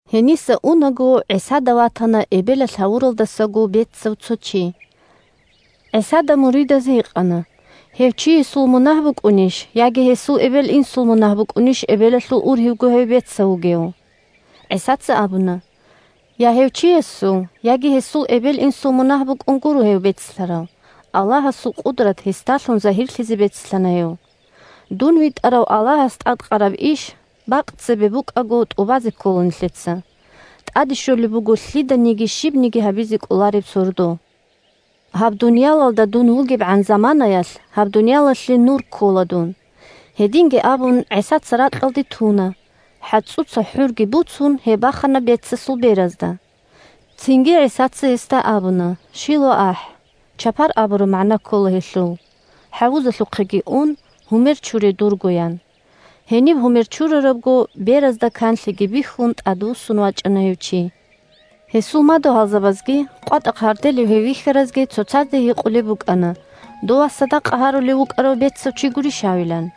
Гьениса унаго ГӀисада ватана эбелалъ гьавуралдасаго бецав цо чи. ГӀисада муридаз гьикъана, гьев чиясул мунагь букӀунищ яги гьесул эбел-инсул мунагь букӀунищ эбелалъул ургьивго гьев бецав вугев. ГӀисаца абуна: – Я гьев чиясул, яги гьесул эбел-инсул мунагь букӀун гуро гьев бецлъарав, Аллагьасул къудрат гьесдалъун загьирлъизе бецлъана гьев. Дун витӀарав Аллагьас тӀадкъараб иш, бакъ цебе букӀаго, тӀубазе ккола нилъеца. ТӀаде щолеб буго лъиданиги щибниги гьабизе кӀолареб сордо. Гьаб дуниялалда дун вугебгӀан заманаялъ гьаб дуниялалъе Нур ккола дун. Гьединги абун, ГӀисаца ракьалде туна, хӀацӀуца хӀурги буцун, гьеб бахана бецасул беразда. Цинги ГӀисаца гьесда абуна: – ШилоахӀ («Чапар» абураб магӀна ккола гьелъул) хӀавузалъухъеги ун, гьумер чуре дурго, – ян. Гьениб гьумер чурарабго беразда канлъиги бихьун, тӀадвуссун вачӀана гьев чи. Гьесул мадугьалзабазги къватӀахъ гьарделев гьев вихьаразги цоцазда гьикъулеб букӀана дова садакъа гьарулев вукӀарав бецав чи гурищ гьавилан.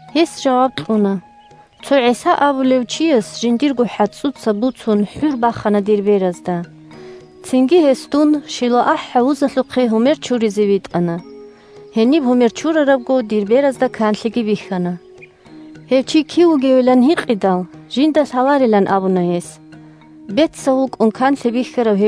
Гьес жаваб кьуна: – Цо ГӀиса абулев чияс жиндирго хӀацӀуца буцун хӀур бахана дир беразда. Цинги гьес дун ШилоахӀ хӀавузалъухъе гьумер чуризе витӀана. Гьениб гьумер чурарабго, дир беразда канлъиги бихьана. Гьев чи кив вугевилан гьикъидал, жинда лъаларилан абуна гьес. «Дур бецал беразда канлъи кин бихьараб?»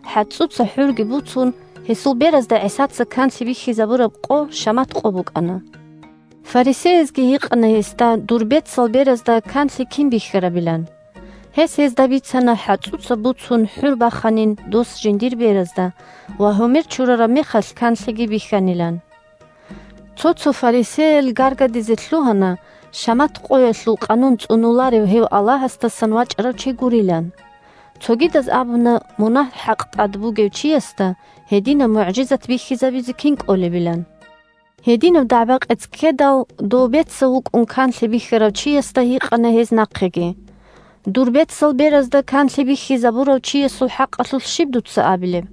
(ХӀацӀуца хӀурги буцун, гьесул беразда ГӀисаца канлъи бихьизабураб къо шамат къо букӀана.) Фарисеязги гьикъана гьесда дур бецал беразда канлъи кин бихьарабилан. Гьес гьезда бицана хӀацӀуца буцун хӀур баханин дос жиндир беразда ва гьумер чурараб мехалъ канлъиги бихьанилан. Цо-цо фарисеял гаргадизе лъугьана шамат къоялъул къанун цӀунуларев гьев Аллагьасдасан вачӀарав чи гурилан. Цогидаз абуна мунагь-хӀакъ тӀад бугев чиясда гьединаб мугӀжизат бихьизабизе кин кӀолебилан. Гьединаб дагӀба-къец ккедал, дов бецав вукӀун канлъи бихьарав чиясда гьикъана гьез нахъеги: – Дур бецал беразда канлъи бихьизабурав чиясул хӀакъалъулъ щиб дуца абилеб?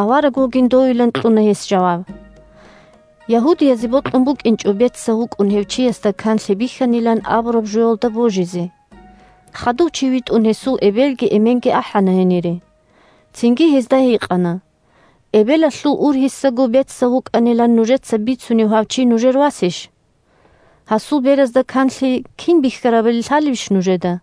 Авараг вугин довилан кьуна гьес жаваб. Ягьудиязе бокьун букӀинчӀо бецав вукӀун гьев чиясда канлъи бихьанилан абураб жоялда божизе. Хадув чи витӀун гьесул эбелги эменги ахӀана гьенире. Цинги гьезда гьикъана: – Эбелалъул ургьисаго бецав вукӀанилан нужеца бицунев гьав чи нужер васищ? Гьасул беразда канлъи кин бихьарабали лъалебищ нужеда?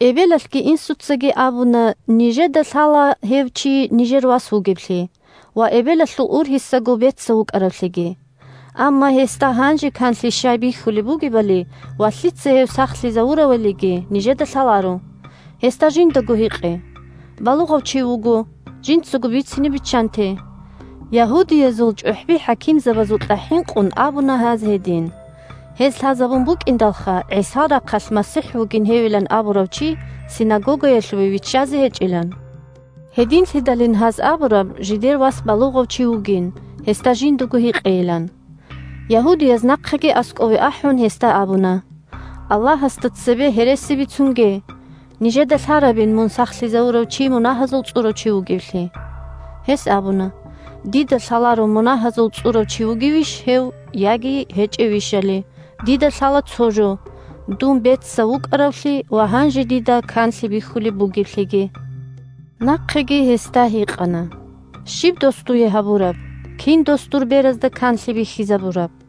Эбелалъги инсуцаги абуна нижеда лъала гьев чи нижер вас вугевлъи ва эбелалъул ургьисаго бецав вукӀаравлъиги. Амма гьесда гьанже канлъи щай бихьулеб бугебалиги ва лъица гьев сахлъизавуравалиги нижеда лъаларо. Гьесда жиндаго гьикъе. Балугъав чи вуго, жинцаго бицине биччанте. ( Ягьудиязул чӀухӀби-хӀакимзабазукьа хӀинкъун абуна гьаз гьедин: гьез лъазабун букӀиндалха, ГӀисал рахъалъ МасихӀ вугин гьевилан абурав чи синагогаялъуве виччазе гьечӀилан. Гьединлъидалин гьаз абураб жидер вас балугъав чи вугин, гьесда жиндаго гьикъейилан.) Ягьудияз нахъеги аскӀове ахӀун, гьесда абуна: – Аллагьасда цебе гьереси бицунге! Нижеда лъарабин мун сахлъизавурав чи мунагьазул цӀурав чи вугевлъи. Гьес абуна: – Дида лъаларо мунагьазул цӀурав чи вугевищ гьев яги гьечӀевищали. Дида лъала цо жо: дун бецав вукӀаравлъи ва гьанже дида канлъи бихьулеб бугеблъиги. Нахъеги гьикъана гьесда: – Щиб дос дуе гьабураб? Кин дос дур беразда канлъи бихьизабураб?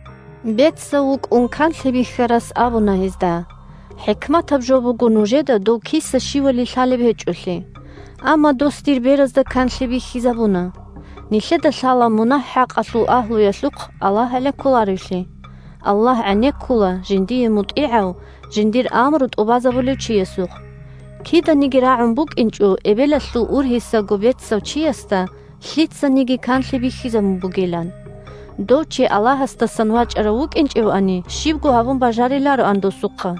Бецав вукӀун канлъи бихьарас абуна гьезда: – ХӀикматаб жо буго нужеда дов киса-щивали лъалеб гьечӀолъи. Амма дос дир беразда канлъи бихьизабуна. Нилъеда лъала мунагь-хӀакъалъул агьлуялъухъ Аллагь гӀенеккуларевлъи. Аллагь гӀенеккула жиндие мутӀигӀав, жиндир амру тӀубазабулев чиясухъ. Киданиги рагӀун букӀинчӀо эбелалъул ургьисаго бецав чиясда лъицаниги канлъи бихьизабун бугилан. Дов чи Аллагьасдасан вачӀарав вукӀинчӀевани, щибго гьабун бажарилароан досухъа.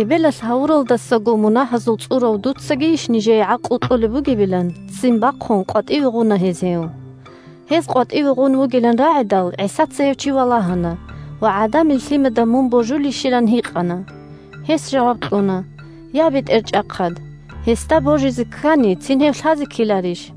Эбелалъ гьавуралдасаго мунагьазул цӀурав дуцагийищ нижее гӀакълу кьолеб бугебилан, ццин бахъун, къватӀиве гъуна гьез гьев. Гьез къватӀиве гъун вугилан рагӀидал, ГӀисаца гьев чи валагьана ва ГӀадамил Лъимада мун божулищилан гьикъана. Гьес жаваб кьуна: – Я, БетӀерчӀахъад, гьесда божизе ккани, цин гьев лъазе ккеларищ?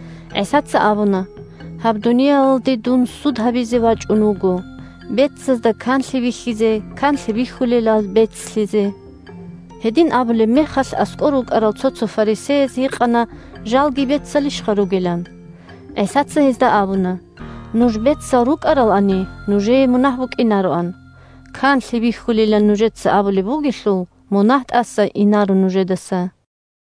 ГӀисаца абуна: – Гьаб дуниялалде дун суд гьабизе вачӀун вуго: бецазда канлъи бихьизе, канлъи бихьулелал бецлъизе. Гьедин абулеб мехалъ аскӀор рукӀарал цо-цо фарисеяз гьикъана жалги бецалищха ругелан. ГӀисаца гьезда абуна: – Нуж бецал рукӀаралани, нужее мунагь букӀинароан. Канлъи бихьулилан нужеца абулеб бугелъул, мунагь тӀаса инаро нужедаса.